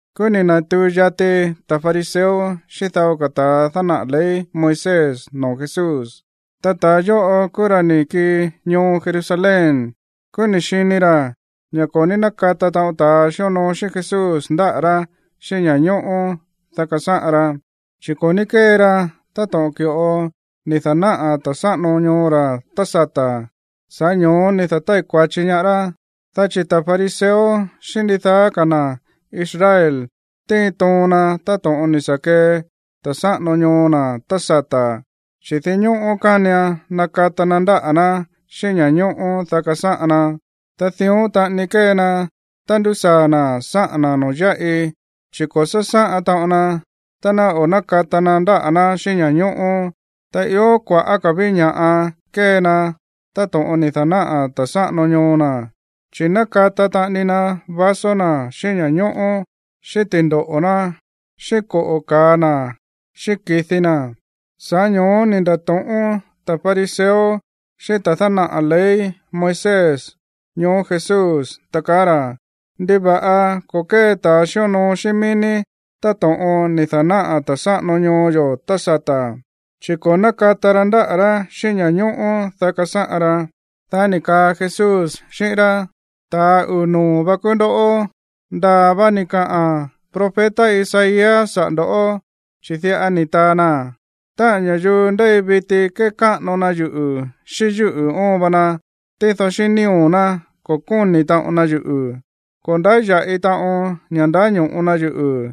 Kúú ni̱ na̱tuu yati ta̱ fariseo xíꞌín dao ta̱a dánaꞌa̱ ley Moisés noo̱ Jesús. Ta ta̱a yóꞌo kúú ra̱ ni̱ kii ñoo Jerusalén. Kúú ni̱ xini ra̱ ña̱ ko̱ ní nákata taꞌon ta̱a xíonoo xíꞌín Jesús ndáꞌa̱ rá xíꞌín ña̱ñóꞌó, dá kasáꞌan ra. Chi̱ ko̱ ní kée ra táto̱ꞌon ki̱ꞌo ni̱ da̱náꞌa̱ ta̱ sáꞌano ñoo ra̱ tá sata̱. Sa̱ꞌá ño̱ó ni̱ da̱tái̱ kua̱chi ñaá rá, dá chi̱ ta̱ fariseo xíꞌín ndidaá ka̱ na̱ Israel tíin toon na táto̱ꞌon ni̱ sa̱ kee ta̱ sáꞌano ñoo na̱ tá sata̱, chi̱ dinñóꞌó kánian nakata na ndáꞌa̱ ná xíꞌín ña̱ñóꞌó, dá kasáꞌan na. Ta dión taꞌani kée na tá ndúsaa̱ na̱ sáꞌa̱n na̱ noo̱ yáꞌi, chi̱ ko̱ sásáꞌan taꞌon na tá ná o̱ nákata na ndáꞌa̱ ná xíꞌín ña̱ñóꞌó. Ta ió kua̱ꞌá ka̱ ví ña̱ꞌa kée na táto̱ꞌon ni̱ da̱náꞌa̱ ta̱ sáꞌano ñoo na̱, chi̱ nákata taꞌani na vaso na̱ xíꞌín ña̱ñóꞌó, xíꞌín ti̱ndoꞌo̱ ná, xíꞌín koꞌo̱ ka̱a na̱, xíꞌín ki̱di na̱. Sa̱ꞌá ño̱ó ni̱ nda̱to̱ꞌón ta̱ fariseo xíꞌín ta̱ dánaꞌa̱ ley Moisés ñoó Jesús, ta kaá ra̱: ―¿Ndiva̱ꞌa ko̱ kée ta̱ xíonoo xíꞌín mií ní táto̱ꞌon ni̱ da̱náꞌa̱ ta̱ sáꞌano ñoo yo̱ tá sata̱? Chi̱ ko̱ nákata ra ndáꞌa̱ rá xíꞌín ña̱ñóꞌó, dá kasáꞌan ra. Dá ni̱ kaa Jesús xíꞌín rá: ―Ta̱a uu̱ noo̱ vá kúú ndoꞌó. Ndaa̱ va ni̱ kaꞌa̱n profeta Isaías saꞌa̱ ndo̱ꞌó, chi̱ diꞌa ni̱ taa na: Táꞌa̱n ña̱yuu ndéi viti kékáꞌano na yuꞌu̱ xíꞌín yúꞌu̱ óon va na, tído xíꞌín nío̱ ná, ko̱ kóni̱ taꞌon na yuꞌu̱. Ko̱ ndáya̱ꞌi taꞌon ña̱ ndáño̱ꞌo na yuꞌu̱,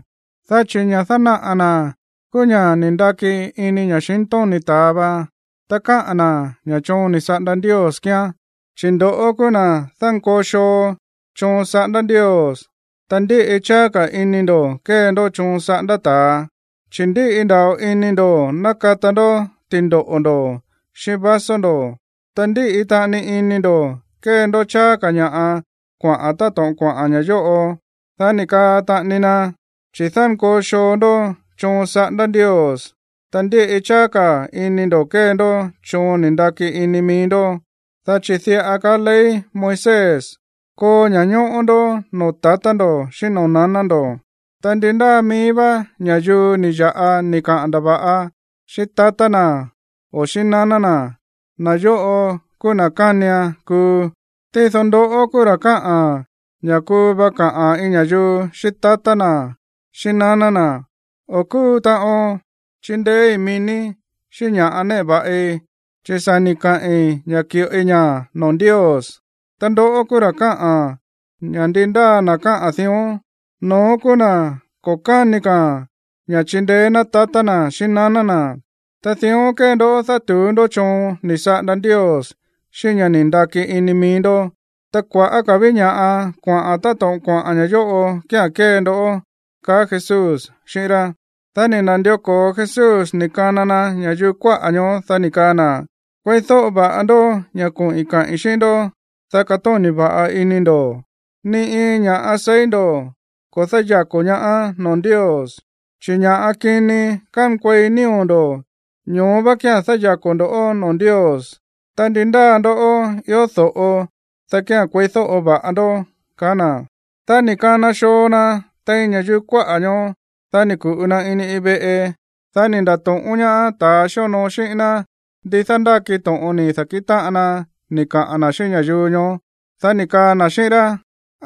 dá chi̱ ña̱ dánaꞌa̱ na̱ kúú ña̱ ni̱ ndaki ini ña̱xintóni̱ ta̱a va, ta káꞌa̱n na̱ ña̱ choon ni̱ saꞌanda Ndios kíán. Chi̱ ndo̱ꞌó kúú na̱ dánkoo xoo choon saꞌándá Ndios, ta ndíꞌi cháá ka̱ ini ndo̱ kée ndó choon saꞌándá ta̱a, chi̱ ndíꞌi nda̱ꞌo ini ndo̱ nákata ndó ti̱ndoꞌo̱ ndo̱, xíꞌín vaso ndo̱, ta ndíꞌi taꞌani ini ndo̱ kée ndó cháá ka̱ ña̱ꞌa kuaꞌa̱n táto̱ꞌon kuaꞌa̱n ña̱ yóꞌo. Dá ni̱ kaa taꞌani na: ―Chi̱ dánkoo xoo ndó choon saꞌándá Ndios, ta ndíꞌi cháá ka̱ ini ndo̱ kée ndó choon ni̱ ndaki ini mií ndó. Dá chi̱ diꞌa kaá ley Moisés: “Koo ña̱ñóꞌó ndó noo̱ tatá ndo̱ xíꞌín noo̱ naná ndo̱”, ta “Ndi ndáa mií vá ña̱yuu ni̱ ya̱ꞌa ni̱ kaꞌa̱n ndava̱ꞌa xíꞌín tatá na̱ o xíꞌín naná na̱, na̱ yóꞌo kúú na̱ kánian kuu.” Tído ndoꞌó kúú ra̱ káꞌa̱n ña̱ kuu va kaꞌa̱n iin ña̱yuu xíꞌín tatá na̱, xíꞌín naná na̱: “O̱ kúu taꞌon chindeéí mií ní xíꞌín ña̱ꞌa néꞌe va̱ꞌi, chi̱ sa̱ ni̱ kaꞌi̱n ña̱ ki̱ꞌoi ña̱ noo̱ Ndios.” Ta ndoꞌó kúú ra̱ káꞌa̱n ña̱ ndi ndáa na̱ káꞌa̱n dión, no̱ón kúú na̱ ko̱ káni ka̱a̱n ña̱ chindeé ná tatá na̱ xíꞌín naná na̱. Ta dión kée ndó dátu̱ú ndó choon ni̱ saꞌanda Ndios xíꞌín ña̱ ni̱ ndaki ini mií ndó. Ta kua̱ꞌá ka̱ ví ña̱ꞌa kuaꞌa̱n táto̱ꞌon kuaꞌa̱n ña̱ yóꞌo kía̱n kée ndó ―kaá Jesús xíꞌín rá. Dá ni̱ na̱ndió ko̱o Jesús ni̱ kana na ña̱yuu kuáꞌa̱ ñoó, dá ni̱ kaa na̱: ―Kueídóꞌo va̱ꞌa ndó ña̱ koꞌi̱n kaꞌi̱n xíꞌín ndó, dá katóni̱ va̱ꞌa ini ndo̱. Ni iin ña̱ꞌa seí ndo̱ ko̱ dáyako̱ ñaá noo̱ Ndios, chi̱ ña̱ kini kánkuei nío̱ ndo̱, ño̱ó vá kía̱n dáyako̱ ndo̱ꞌó noo̱ Ndios. Ta ndi ndáa ndoꞌó ió do̱ꞌo, dá kía̱n kueídóꞌo va̱ꞌa ndó ―kaá na̱. Dá ni̱ kana xoo na tein ña̱yuu kuáꞌa̱ ñoó. Dá ni̱ ku̱ꞌu na ini iin veꞌe. Dá ni̱ nda̱to̱ꞌón ñaá ta̱a xíonoo xíꞌín ná ndi dándáki to̱ꞌon ni̱ da̱kíꞌin táꞌan na ni̱ kaꞌa̱n na̱ xíꞌín ña̱yuu ñoó. Dá ni̱ kaa na̱ xíꞌín rá: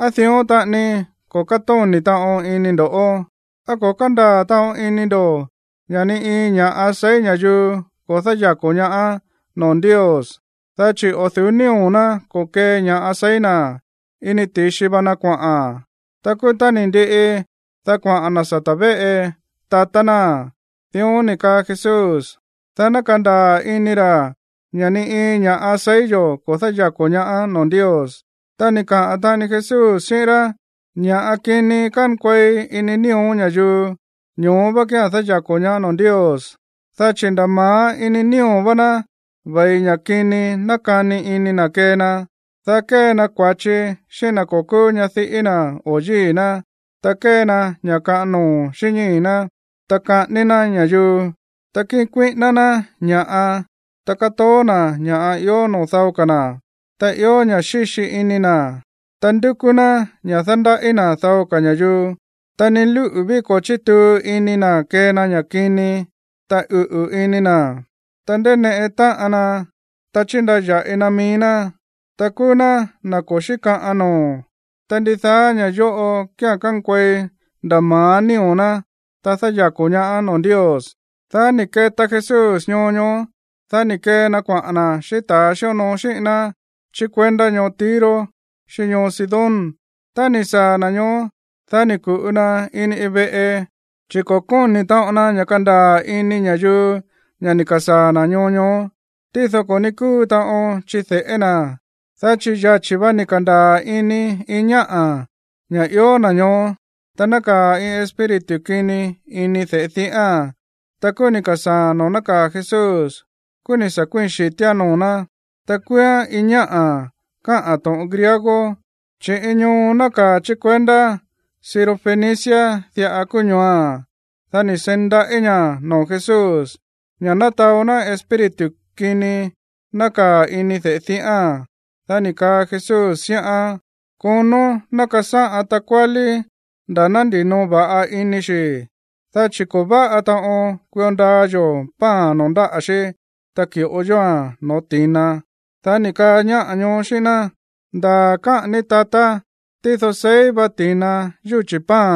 ―¿Á dión taꞌani ko̱ kátóni̱ taꞌon ini ndo̱ꞌó? ¿Á ko̱ kándaa̱ taꞌon ini ndo̱ ña̱ ni iin ña̱ꞌa seí ña̱yuu ko̱ dáyako̱ ñaá noo̱ Ndios? Dá chi̱ o̱ du̱ú nío̱ ná ko̱kee ña̱ꞌa seí na̱. Ini ti̱xi va na kuaꞌa̱n. Ta kúú tá ni̱ ndiꞌi, dá kuaꞌa̱n na̱ sata̱ véꞌe tatá náa̱n. Dión ni̱ kaa Jesús, dá ná kandaa̱ ini ra̱ ña̱ ni iin ña̱ꞌa seí yo̱ ko̱ dáyako̱ ñaá noo̱ Ndios. Ta ni̱ kaa taꞌani Jesús xíꞌín rá: ―Ña̱ kini kánkuei ini nío̱ ña̱yuu, ño̱ó vá kía̱n dáyako̱ ñaá noo̱ Ndios. Dá chi̱ nda̱ ma̱á ini nío̱ vá ná ve̱i ña̱ kini nákani ini na̱ kee na, dá kee na kua̱chi xíꞌín na̱ ko̱ kúú ñadiꞌí na̱ o yíi̱ ná, ta kée na ña̱ kaꞌan noo̱ xíꞌín ñíi̱ ná, ta saꞌání ná ña̱yuu, ta kíꞌin kuíꞌíná ná ña̱ꞌa, ta kátoó na̱ ña̱ꞌa ió noo̱ dao ka̱ na̱, ta ió ña̱ xíxi ini na̱, ta ndúkú ná ña̱ dándaꞌí na̱ dao ka̱ ña̱yuu, ta ni lúꞌu̱ ví ko̱ chítuu ini na̱ kée na ña̱ kini, ta uꞌu̱ ini na̱, ta ndéineꞌe táꞌan na, ta chíndaya̱ꞌi na mií ná, ta kúú ná na̱ ko̱ xíkaꞌan noo̱. Ta ndidaá ña̱ yóꞌo kía̱n kánkuei nda̱ ma̱á nío̱ ná, ta dáyako̱ ñaá noo̱ Ndios. Dá ni̱ keta Jesús ñoo ñoó, dá ni̱ kee na kuaꞌa̱n na̱ xíꞌín ta̱a xíonoo xíꞌín ná chí kuendá ñoo Tiro xíꞌín ñoo Sidón. Tá ni̱ saa̱ na̱ ñoó, dá ni̱ ku̱ꞌu na ini iin veꞌe, chi̱ ko̱ kóni̱ taꞌon na ña̱ kandaa̱ ini ña̱yuu ña̱ ni̱ ka̱sáa̱ na̱ ñoo ñoó. Tído ko̱ ní kúu taꞌon chide̱ꞌé na̱, dá chi̱ yachi̱ vá ni̱ ka̱ndaa̱ ini iin ñáꞌa̱ ña̱ ió na̱ ñoó. Ta nákaa̱ iin espíritu kini ini de̱ꞌe diꞌáa̱n. Ta kúú ni̱ ka̱sáa̱a̱n noo̱ nákaa̱ Jesús, kúú ni̱ sa̱ kuíi̱n xi̱tíán noo̱ ná. Ta kúúán iin ñáꞌa̱ káꞌa̱n to̱ꞌon griego, chi̱ iin ñoo nákaa̱ chí kuendá Sirofenicia diꞌa kúú ñooa̱n. Dá ni̱ seí ndaꞌí ña̱ noo̱ Jesús ña̱ ná taó ná espíritu kini nákaa̱ ini de̱ꞌe diꞌáa̱n. Dá ni̱ kaa Jesús xíꞌán: ―Konó ná kasáꞌan takuálí nda̱ ná ndinoo va̱ꞌa ini xi̱, dá chi̱ ko̱ váꞌa taꞌon kuio ndaa yo̱ pan noo̱ ndáꞌa̱ xí, ta ki̱ꞌo yóa̱n no̱ó ti̱na. Dá ni̱ kaa ñáꞌa̱ ñoó xíꞌín ná: ―Ndaa̱ káꞌa̱n ní, tatá. Tído seí va ti̱na yúchi̱ pan,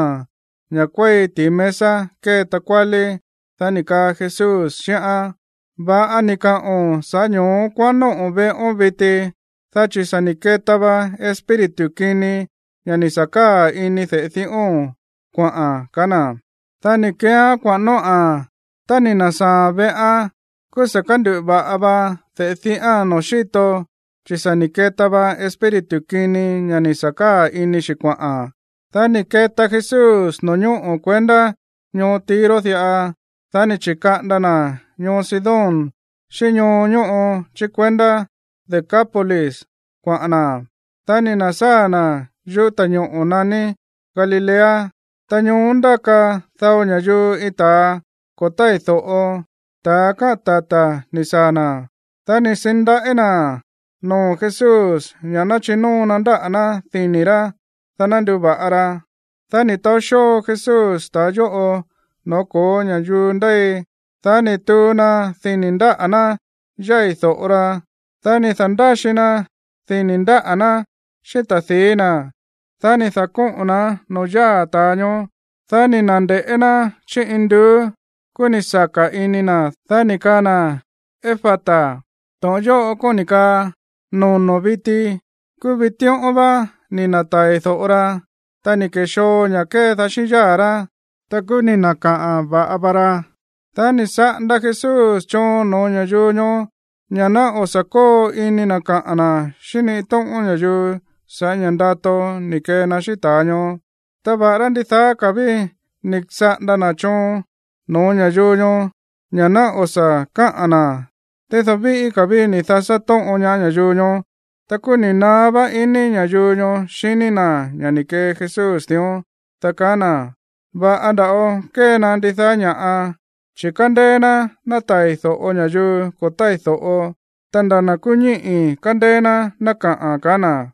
ña̱ kuéi ti̱i mesa kée takuálí. Dá ni̱ kaa Jesús xíꞌán: ―Va̱ꞌa ni̱ kaꞌo̱n, sa̱ꞌá ño̱ó kuaꞌán nóꞌo̱ veꞌón viti, dá chi̱ sa̱ ni̱ keta va espíritu kini ña̱ ni̱ sa̱ káa̱ ini de̱ꞌe diꞌóo̱n kuaꞌa̱n ―kaá na̱. Dá ni̱ keeán kuaꞌa̱n nóꞌa̱n. Tá ni̱ na̱sáa̱a̱n veꞌán, kúú sa̱ kánduꞌu̱ va̱ꞌa va de̱ꞌe diꞌáa̱n noo̱ xíto, chi̱ sa̱ ni̱ keta va espíritu kini ña̱ ni̱ sa̱ káa̱ ini xi̱ kuaꞌa̱n. Dá ni̱ keta Jesús no̱ñóꞌo̱ kuendá ñoo Tiro diꞌa. Dá ni̱ chi̱kaꞌanda na̱ ñoo Sidón xíꞌín ñoo ñóꞌo chí kuendá Decápolis kuaꞌa̱n na̱. Dá ni̱ na̱sáa̱ na̱ yuꞌú ta̱ñoꞌo̱ naní Galilea. Ta ñoó ndáka dao ña̱yuu iin ta̱a ko̱ tái̱ do̱ꞌo, ta̱ káꞌa̱n tata̱ ni̱ saa̱ na̱. Dá ni̱ seí ndaꞌí na̱ noo̱ Jesús ña̱ ná chinóo na ndáꞌa̱ ná dini̱ rá, dá ná nduva̱ꞌa ra. Dá ni̱ taó xóo Jesús ta̱a yóꞌo no̱ó ko̱ó ña̱yuu ndéi. Dá ni̱ tuu na dini̱ ndáꞌa̱ ná yái̱ do̱ꞌo ra. Dá ni̱ da̱ndáxi na dini̱ ndáꞌa̱ ná xíꞌín ta̱di̱í na̱, dá ni̱ da̱kóꞌo̱n na̱án noo̱ yáa̱ ta̱a ñoó. Dá ni̱ na̱nde̱ꞌé ná chí induú, kúú ni̱ saka̱ ini na̱. Dá ni̱ kaa na̱: ―¡Efata! ―To̱ꞌon yóꞌo kóni̱ kaa: ¡Nono̱ viti! Kúú vitíꞌón vá ni̱ na̱tai̱ do̱ꞌo ra, ta ni̱ ke̱xoo ña̱ kedaá xíꞌín yáa̱ rá, ta kúú ni̱ na̱kaꞌa̱n va̱ꞌa va ra. Dá ni̱ saꞌanda Jesús choon no̱ó ña̱yuu ñoó ña̱ ná o̱ sa̱ kóo ini na̱ kaꞌa̱n na̱ xíꞌín ni iin tóꞌón ña̱yuu sa̱ꞌá ña̱ ndato ni̱ kee na xíꞌín ta̱a ñoó. Ta va̱ꞌará ndidaá ka̱ ví ni̱ saꞌanda na̱ choon no̱ó ña̱yuu ñoó ña̱ ná o̱ sa̱ káꞌa̱n na̱, tído víꞌí ka̱ ví ni̱ dasá tóꞌon ñaá ña̱yuu ñoó. Ta kúú ni̱ naá va iní ña̱yuu ñoó xiní na̱ ña̱ ni̱ kee Jesús dión, dá kaá na̱: ―Va̱ꞌa nda̱ꞌo kée na ndidaá ña̱ꞌa. Chi̱ kándéé ná nátai̱ do̱ꞌo ña̱yuu ko̱ tái̱ do̱ꞌo, ta nda̱ na̱ kúú ñíꞌi̱ kándéé ná ná kaꞌa̱n ―ka̱á na̱.